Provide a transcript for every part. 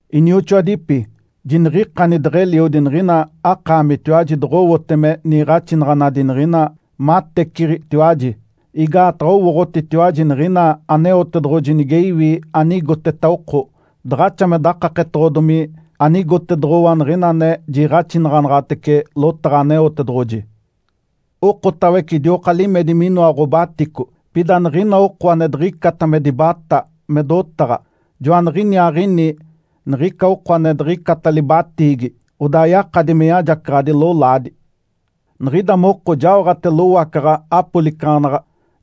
Inioxoadipi, jiniɡ̶ikani deɡ̶eliodi niɡ̶ina akaamitiwaji doɡ̶owote me niiɡ̶axinaɡ̶anadi niɡ̶ina mateciɡ̶itiwaji. Igaataɡ̶a owooɡ̶otitiwaji niɡ̶ina Aneotedoɡ̶oji nige iwi anigoteta oko, daɡ̶axa me dakaketoɡ̶odomi anigotedoɡ̶owa niɡ̶ina ane jiiɡ̶axinaɡ̶anaɡ̶atece lotaɡ̶a Aneotedoɡ̶oji. Okotawece idioka limedi minoa ɡ̶obatico. Pida niɡ̶ina oko ane diɡ̶icata me dibatá me dotaɡ̶a, joaniɡ̶iniaaɡ̶ini niɡ̶ica oko ane diɡ̶icata libatiigi, odaa yakadi me yajacaɡ̶adi lolaadi. Niɡ̶ida moko jaoɡ̶ate lowacaɡ̶a apolicaɡ̶anaɡ̶a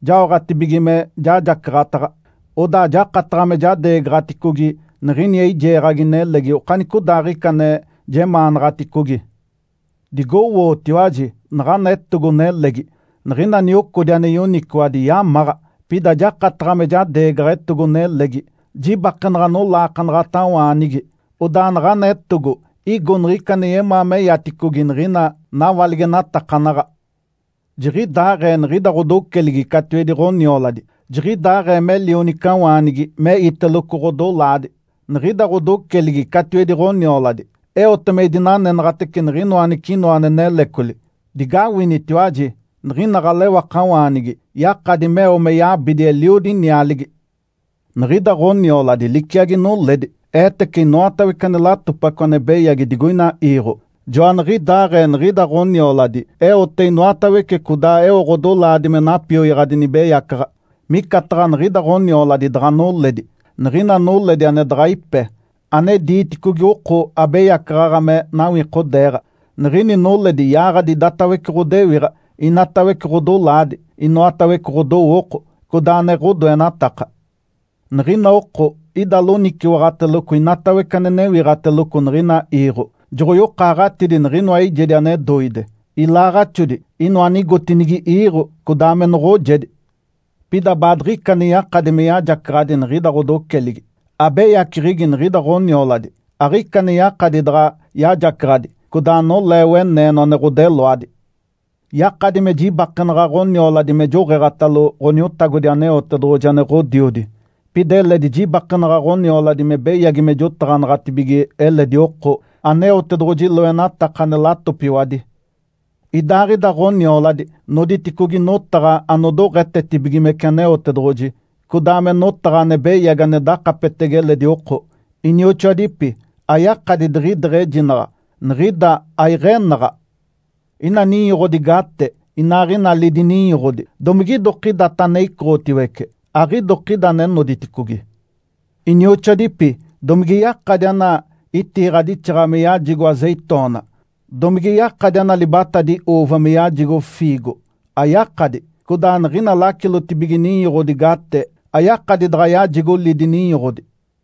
jaoɡ̶atibige me jajacaɡ̶ataɡ̶a, odaa jakataɡ̶a me jadeegaɡ̶aticogi niɡ̶ini eijeeɡ̶agi nelegi okanicodaaɡ̶ica ane jemaanaɡ̶aticogi. Digowootiwaji naɡ̶ana etogo-nelegi. Niɡ̶ina niocodi ane yoniciwadi yamaɡ̶a, pida jakataɡ̶a me jadeegaɡ̶a etogo-nelegi jibakenaɡ̶a nolaakanaɡ̶atawaanigi. Odaa naɡ̶ana etogo igo niɡ̶ica ane yemaa meyaticogi niɡ̶ina nawaligenatakanaɡ̶a. Jiɡ̶idaaɡ̶ee niɡ̶ida ɡ̶odoceligi catiwedi ɡ̶onioladi. Jiɡ̶idaaɡ̶ee me lionicawaanigi me iteloco ɡ̶odolaadi, niɡ̶ida ɡ̶odoceligi catiwedi ɡ̶onioladi eote me idinanenaɡ̶atece niɡ̶inoa anicinoa ane nelecoli. Digawinitiwaji! Niɡ̶ina ɡ̶alewakawaanigi yakadi meo me yabidi eliodi nialigi. Niɡ̶ida ɡ̶onioladi liciagi noledi. Eetece inoatawece ane latopaco ane beyagi digoina iiɡ̶o. Joaniɡ̶idaaɡ̶ee niɡ̶ida ɡ̶onioladi eote inoatawece codaa eo ɡ̶odolaadi me napioyaɡ̶adi nibeyacaɡ̶a. Micataɡ̶a niɡ̶ida ɡ̶onioladi daɡ̶a noledi, niɡ̶ina noledi ane daɡ̶a ipe, ane diiticogi oko abeyacaɡ̶aɡ̶a me nawikodeeɡ̶a. Niɡ̶ini noledi yaaɡ̶adi idatawece ɡ̶odewiɡ̶a, inatawece ɡ̶odolaadi, inoatawece ɡ̶odowooko, codaa ane ɡ̶odoenataka. Niɡ̶ina oko ida loniciwaɡ̶ateloco inoatawece ane newiɡ̶ateloco niɡ̶ina iiɡ̶o. Joɡ̶oyokaaɡ̶atidi niɡ̶inoa eijedi ane doide, ilaaɡ̶axodi, inoa anigotinigi iiɡ̶o, codaa me noɡ̶ojedi. Pida baadiɡ̶ica ane yakadi me yajacaɡ̶adi niɡ̶ida ɡ̶odoceligi. Abeyaceɡ̶egi niɡ̶ida ɡ̶onioladi, aɡ̶ica ane yakadi daɡ̶a yajacaɡ̶adi, codaa nolee weneeno ane ɡ̶odeloadi. Yakadi me jibakenaɡ̶a ɡ̶onioladi me joɡ̶eeɡ̶atalo Ǥoniotagodi Aneotedoɡ̶oji ane Ǥodiodi. Pida eledi jibakenaɡ̶a ɡ̶onioladi me beyagi me jotaɡ̶anaɡ̶atibige eledi oko Aneotedoɡ̶oji loenataka ane latopiwadi. Idaaɡ̶ida ɡ̶onioladi noditicogi notaɡ̶a anodoɡ̶etetibigimece Aneotedoɡ̶oji, codaa me notaɡ̶a ane beyagi ane dakapetege eledi oko. Inioxoadipi, ayakadi diɡ̶ideɡ̶ejinaɡ̶a, niɡ̶ida aiɡ̶enaɡ̶a. Ina ninyoɡ̶odi gate, inaaɡ̶ina lidi ninyoɡ̶odi, domigidokidata ane icoɡ̶otiwece? Aɡ̶idokida ane noditicogi! Inioxoadipi, domige yakadi ana itiiɡ̶adixaɡ̶a me yajigo azeitona? Domige yakadi ana libatadi uuva me yajigo fiigo? Ayakadi! Codaa niɡ̶ina lacilotibige ninyoɡ̶odi gate ayakadi daɡ̶a yajigo lidi ninyoɡ̶odi.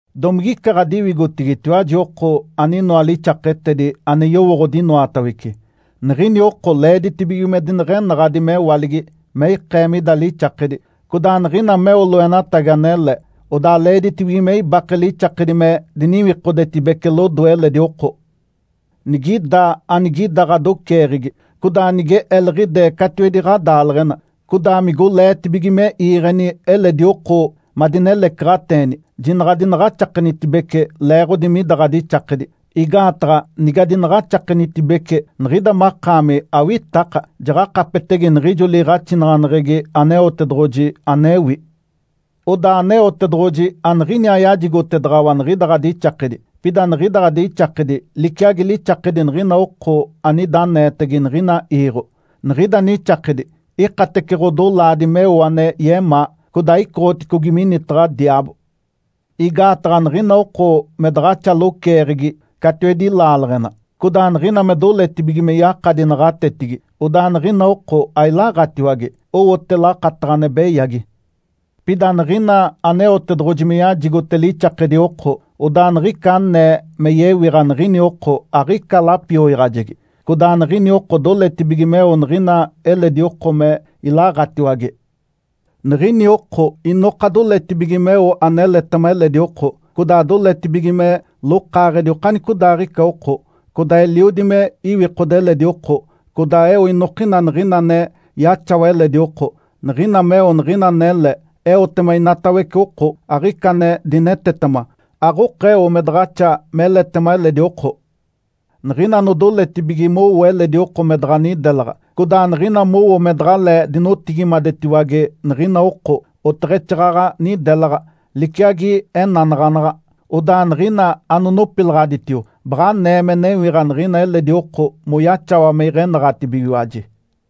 Domigica ɡ̶adiwigotigitiwaji oko aninoa lixaketedi, ane yowooɡ̶odi inoatawece? Niɡ̶ini oko leeditibige me dineɡ̶enaɡ̶adi mewaligi me ikee mida lixakedi. Codaa niɡ̶ina meo loenatagi anele, odaa leeditibige me ibake lixakedi me diniwikodetibece lodoe eledi oko. Nigida anigida ɡ̶adoceeɡ̶egi, codaa nige eliɡ̶idee catiwedi ɡ̶adaaleɡ̶ena, codaa migoleetibige me iiɡ̶eni eledi oko madinelecaɡ̶ateeni, jinaɡ̶a adinaɡ̶axakenitibece leeɡ̶odi mida ɡ̶adixakedi. Igaataɡ̶a nigadinaɡ̶axakenitibece, niɡ̶ida makaami awitaka, jaɡ̶akapetege niɡ̶ijo liiɡ̶axinaɡ̶aneɡ̶egi Aneotedoɡ̶oji anewi. Odaa Aneotedoɡ̶oji aniɡ̶iniaa yajigotedaɡ̶awa niɡ̶ida ɡ̶adixakedi, pida niɡ̶ida ɡ̶adixakedi liciagi lixakedi niɡ̶ina oko anida aneetege niɡ̶ina iiɡ̶o. Niɡ̶ida nixakedi ikatece ɡ̶odolaadi meo ane yemaa, codaa icoɡ̶oticogi minitaɡ̶a diaabo. Igaataɡ̶a niɡ̶ina oko me daɡ̶axa loceeɡ̶egi catiwedi laaleɡ̶ena, codaa niɡ̶ina me doletibige me yakadi naɡ̶atetigi, odaa niɡ̶ina oko ailaɡ̶atiwage, owote lakataɡ̶a ane beyagi. Pida niɡ̶ina Aneotedoɡ̶oji me yajigote lixakedi oko, odaa niɡ̶ica anee me yewiɡ̶a niɡ̶ini oko aɡ̶ica lapioyaɡ̶ajegi. Codaa niɡ̶ini oko doletibige meo niɡ̶ina eledi oko me ilaɡ̶atiwage. Niɡ̶ini oko inoka doletibige meo aneletema eledi oko, codaa doletibige me lokaaɡ̶edi okanicodaaɡ̶ica oko. Codaa eliodi me iwikode eledi oko, codaa eo inokina niɡ̶ina ane yaxawa eledi oko. Niɡ̶ina meo niɡ̶ina anele, eotema inatawece oko, aɡ̶ica ane dinetetema. Aɡ̶okeo me daɡ̶axa meletema eledi oko. Niɡ̶ina anodoletibige mowo eledi oko me daɡ̶a nidelaɡ̶a, codaa niɡ̶ina mowo me daɡ̶alee dinotigimadetiwage niɡ̶ina oko, oteɡ̶exaaɡ̶aɡ̶a nidelaɡ̶a, liciagi enanaɡ̶anaɡ̶a. Odaa niɡ̶ina anonopilaɡ̶aditio baɡ̶a anee me newiɡ̶a niɡ̶ina eledi oko moyaxawa me iɡ̶enaɡ̶atibigiwaji.